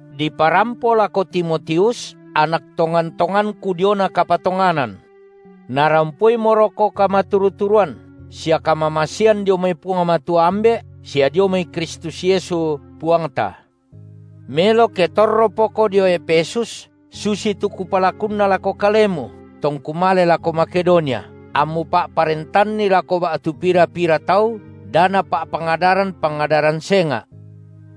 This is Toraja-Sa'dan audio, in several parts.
diparampo lako Timotius, anak tongan-tonganku diona kapatonganan. Narampoimoroko kamaturu-turuan sia kamamasean dio mai Puang Matua Ambe’, sia dio mai Kristus Yesu, Puangta. Melo ke torropoko dio Efesus susitu kupalakunna lako kalemu, tongku male lako Makedonia, ammu pa’parentanni lako ba’tu pira-pira tau, da napa’pangadaran pangadaran senga’,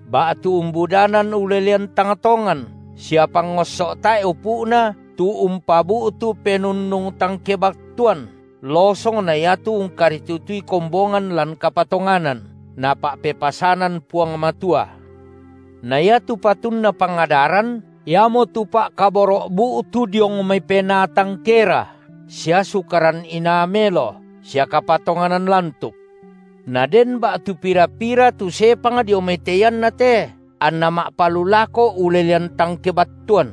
ba’tu umbudanan ulelean tang tongan sia pangosso’ tae’ upu’na tu umpabu’tu penunnung tang kebattuan losong na iatu ungkaritutui kombongan lan kapatonganan, Napa’pepasanan Puang Matua. Na iatu patunna pangadaran, iamotu pa’kaboro’ bu’tu diong mai penaa tang kera sia sukaran inaa melo sia kapatonganan lantuk. Na den ba’tu pira-pira tu sepang dio mai te ianna te, anna ma’palulako ulelean tang kebattuan.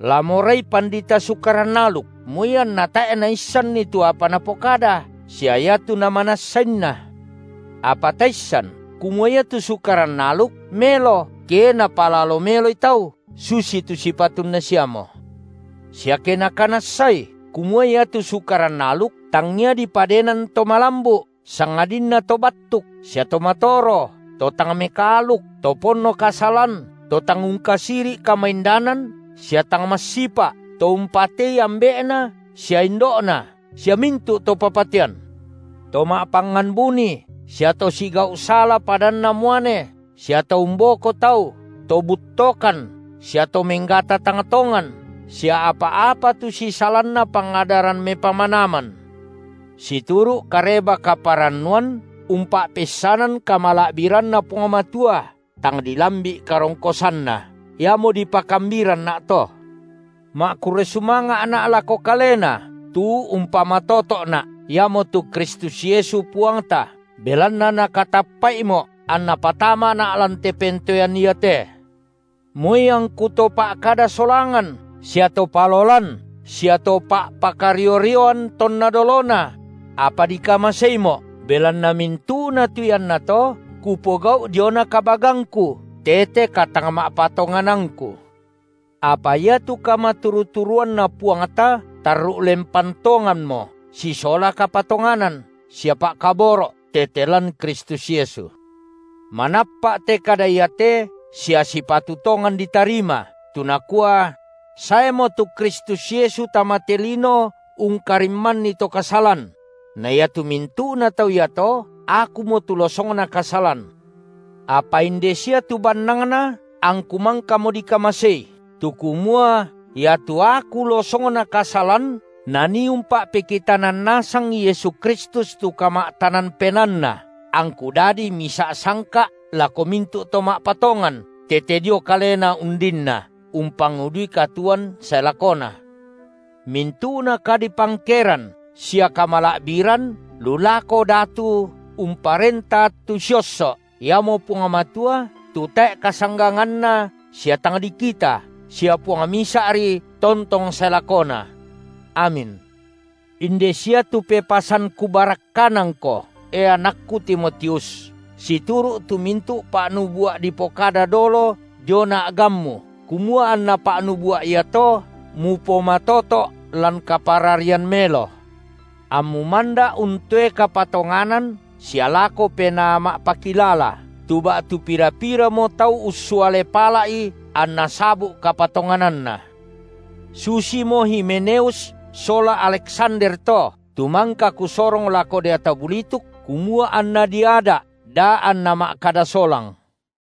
La morai pandita Sukaran aluk, moi anna tae’ naissanni tu apa napokada sia iatu namanassainna. Apa taissan kumua iatu Sukaran aluk melo, ke napalalo meloi tau susitu sipatunna siamo, sia ke nakanassai kumua iatu Sukaran aluk, tangia dipadenan to malambu’, sangadinna to battuk sia to matoro, to tang mekaaluk, to ponno kasalan, to tang ungkasiri’ kamaindanan sia tang massipa’, to umpatei ambe’na sia indo’na sia mintu’ to papatean, to ma’pangngan buni sia to sigau’ sala padanna muane, sia to umboko tau, to buttokan sia to menggata tang tongan, sia apa-apa tu sisalanna pangadaran mepamanaman, situru’ Kareba-kaparannuan umpa’peissanan kamala’biranNa Puang Matua, tang dilambi’ karongkosanNa, iamo dipakambiranna’ to. Ma’kurre sumanga’na’ lako Kalena tu umpamatoto’na’, Iamotu Kristus Yesu Puangta, belanna Nakatappa’imo’, anNa patamana’ lan te pentoean iate, moi angku to pa’kada solangan sia to palolan sia to pa’pakario-rioan tonna dolona; apa dikamaseimo’, belanna mintu’na tu iannato kupogau’ diona kabagangku tete katangma’patonganangku. Apa iatu kamaturu-turuanNa Puangta tarru’ lempan tonganmo sisola kapatonganan sia pa’kaboro’ tete lan Kristus Yesu. Manappa’ te kada iate sia sipatu tongan ditarima, tu nakua: saemo tu Kristus Yesu tama te lino ungkarimmanni to kasalan; na iatu mintu’na tau iato, akumo tu losongna kasalan. Apa inde sia tu bannangna angku mangkamo dikamasei, tu kumua iatu aku losongna kasalan Nanii umpa’pekitanan nasangi Yesu Kristus tu kama’tanan penaanNa, angku dadi misa’ sangka’ lako mintu’ to ma’patongan tete dio Kalena undinna, umpangudui katuoan sae lakona. Mintu’na kadipangkeran sia kamala’biran lu lako Datu umparenta attu siosso’ Iamo Puang Matua tu tae’ kasangganganNa sia tang dikita, sia Puang Misa’ri, tontong sae lakona. Amin. Inde sia tu pepasan kupabarakkanangko, e, anakku Timotius, situru’ tu mintu’ pa’nubua’ dipokada dolo diona a’gammu, kumua anna pa’nubua’ iato mupomatoto’ lan kapararian melo. Ammu manda’ untoe kapatonganan sia lako penaa ma’pakilala, tu ba’tu pira-piramo tau ussuale pala’i, anna sabu’ kapatongananna. Susimo Himeneus sola Aleksander to, tu mangka kusorong lako deata bulituk, kumua anna diada’ da anna ma’kada solang.